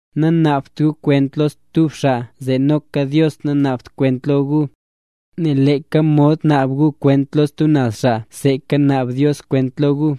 ’Nanaabt gu kwent lo stub xaa zee noka Dios nanaabt kwent lo gu. Nel leeka mod naab gu kwent lo stub naz xaa seeka naab Dios kwent lo gu;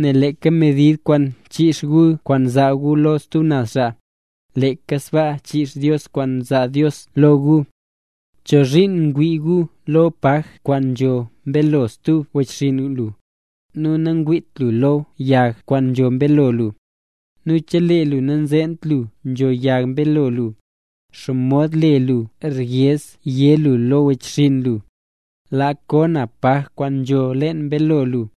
nel leeka medid kwaan nchiix guya kwaan nzaa gu lo stub naz xaa, leeka sbaa chiix Dios kwaan zaa xaa lo gu. ¿Chozhiin ngwii lu lo paj kwaan nzho mbeelo stub wechxinn lu, nu nangwiit lu lo yag kwaan nzho mbeelo lu? Nu chelee lu nanzeent lu nzho yag mbeelo lu, ¿xomod le lu ryez yé lu lo wechxinn lu: “Laa ko na paj kwaan nzho leen mbeelo lu”?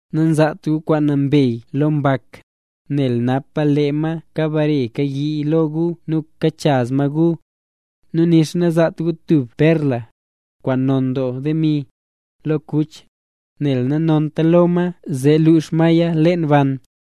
’Nazaat gu kwaan nambey lo mbak, nel napa lee ma kabare kayii lo gu nu kachaz ma gu. Nu nixa nazaat gu tub perla, kwaan non doo demi, lo kuch, nel nanonta lo ma zee luux maya leen ban.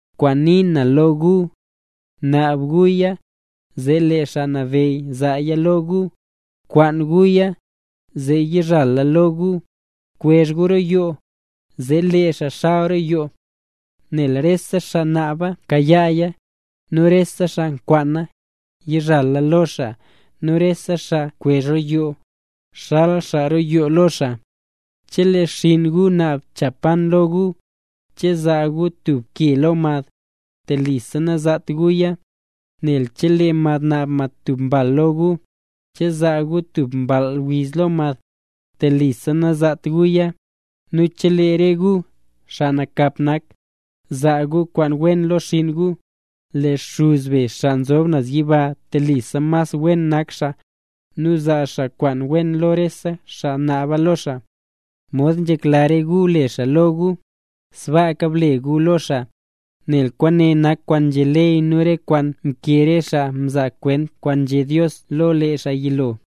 ’Kwaanzee nii na lo gu: gunaab guya, zee lee Xaa Nabeyy zaaya lo gu; Bkwaan guya, zee yizhala lo gu; bkwezh gu roo yoo, zee lee xaa xal roo yoo. Nel rese xaa naaba kayaaya; nu rese xaa nkwaana, yizhala lo xaa; nu rese xaa nkwezh roo yoo, zxal xaa roo yoo lo xaa. ’Chelee xinn gu naab cha pan lo gu, ¿che zaa gu tub ke lo mad? Telisa nazaat guya. Nu chelee mad naab mad tub mbal lo gu, ¿che zaa gu tub mball wiz lo mad? Telisa nazaat guya. Nu chelee re gu, xaa nakap nak, nzaa gu kwaan wen lo xinn gu, ¡lee Xuz be xaa nzob naz yiba telisa mas wenra nak xaa, nu zaa xaa kwaan wen lo rese xaa naaba lo xaa! ’Mod nzhekla gu le xaa lo gu, sbaaka ble gu lo xaa; nel kwaane nak kwaan nzhé ley nu re kwaan mkee re xaa mzaa kwent kwaan nzhé Dios lo lee xaa yilo.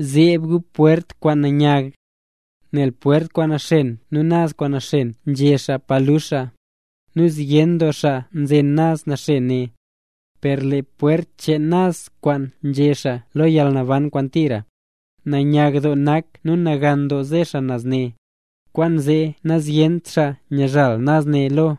’Zeeb gu pwert kwaan nanyag. Nel pwert kwaan naxen nu naz kwaan naxen nzhe xaa pa lux xaa. Nu zyen doo xaa nzen naz naxen ne. Per lee pwert cheen naz kwaan nzhe xaa lo yalnaban kwaan tira, nanyag doo nak nu nagan doo ze xaa naz ne, kwaanzee nazyent xaa nyazhal naz ne lo.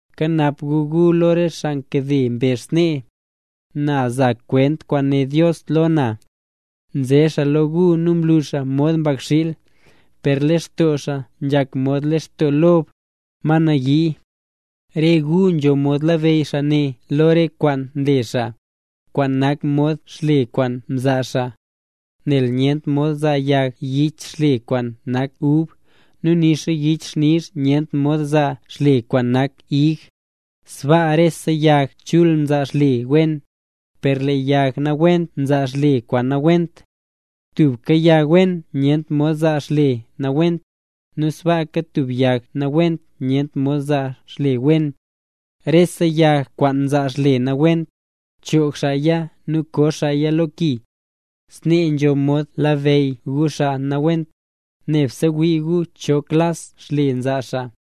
’Kanap gu gu lo re xaa nkade mbezh snee: “Na nza kwent kwaan né Dios lo na”. Nze xaa lo gu nu nlu xaa mod mbakxiil, per lextoo xaa nzhak mod lextoo lob, ma nayii. Re gu nzho mod labeyy xaa ne lo re kwaan nle xaa, kwaan nak mod xle kwaan nzaa xaa. Nel nyent mod zaa yag yich xle kwaan nak ub, nu nixa yixnizh nyent mod zaa xle kwaan nak ig. Sbaa rese yag chul nzaa xle wen, per lee yag nawent nzaa xle nawent. Tub yag wen nyent mod zaa xle nawent, nu sbaaka tub yag nawent nyent mod zaa xle wen. Rese yag kwaan nzaa xle nawent, choog xaaya nu koo xaaya lo ki. Snee nzho mod labeyy gu xaa nawent, nebse wii gu cho klas xle nzaa xaa.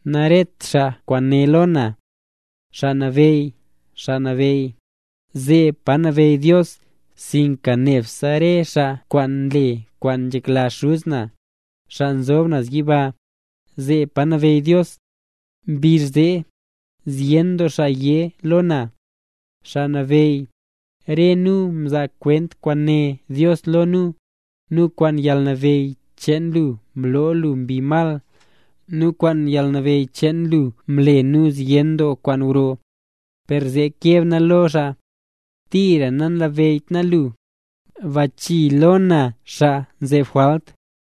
’Naret xaa kwaan né lo na: “Xaa Nabeyy, Xaa Nabeyy”, zeeb pa nabeyy Dios, sinka nebse re xaa kwaan nle kwaan nzhekla Xuz na, xaa nzob naz yiba, zeeb pa nabeyy Dios. Mbizh zee, zyen doo xaa yé lo na: “Xaa Nabeyy, re nu mzaa kwent kwaan né Dios lo nu, nu kwaan yalnabeyy cheen lu mloo nu mbi mal, nu kwaan yalnabeyy cheen lu mle nu zyen doo kwaan gro”. Per zee keb na lo xaa: “¡Tira namlabeyyt na lu, bachii lo na xaa nzeb jwalt!”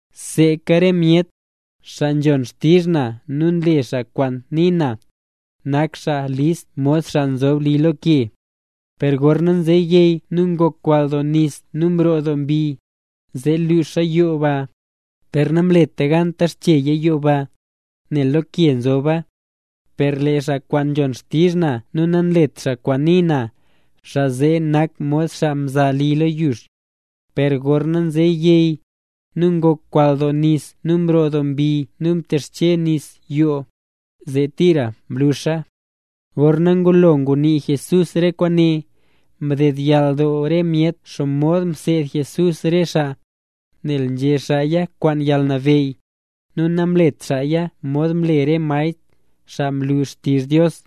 ’Seeka re myet, xaa nzhon xtizh na nu nle xaa kwaan nii na, nak xaa list, mod xaa mza li lo ke. Per gorna nze yey nu ngok kwall doo nis nu mroo doo mbi, zee luuxa yoo ba, per namleta gan mtexcheya yoo ba, nel lo ke nzoba. Per lee xaa kwaan nzhon xtizh na nu nanlet xaa kwaan nii na, xaa zee nak mod xaa mza li lo yux. Per gorna nze yey, nu ngok kwall doo nis nu mroo doo mbi nu mtexche nis yoo, zee tira mluxa. Gorna ngulo ngunii Jesús re kwaane, mdedyall doo re myet xomod mseed Jesús re xaa, nel nzhé xaaya kwaan yalnabeyy, nu namlet xaaya mod nle re maestr, xaa nlu xtizh Dios.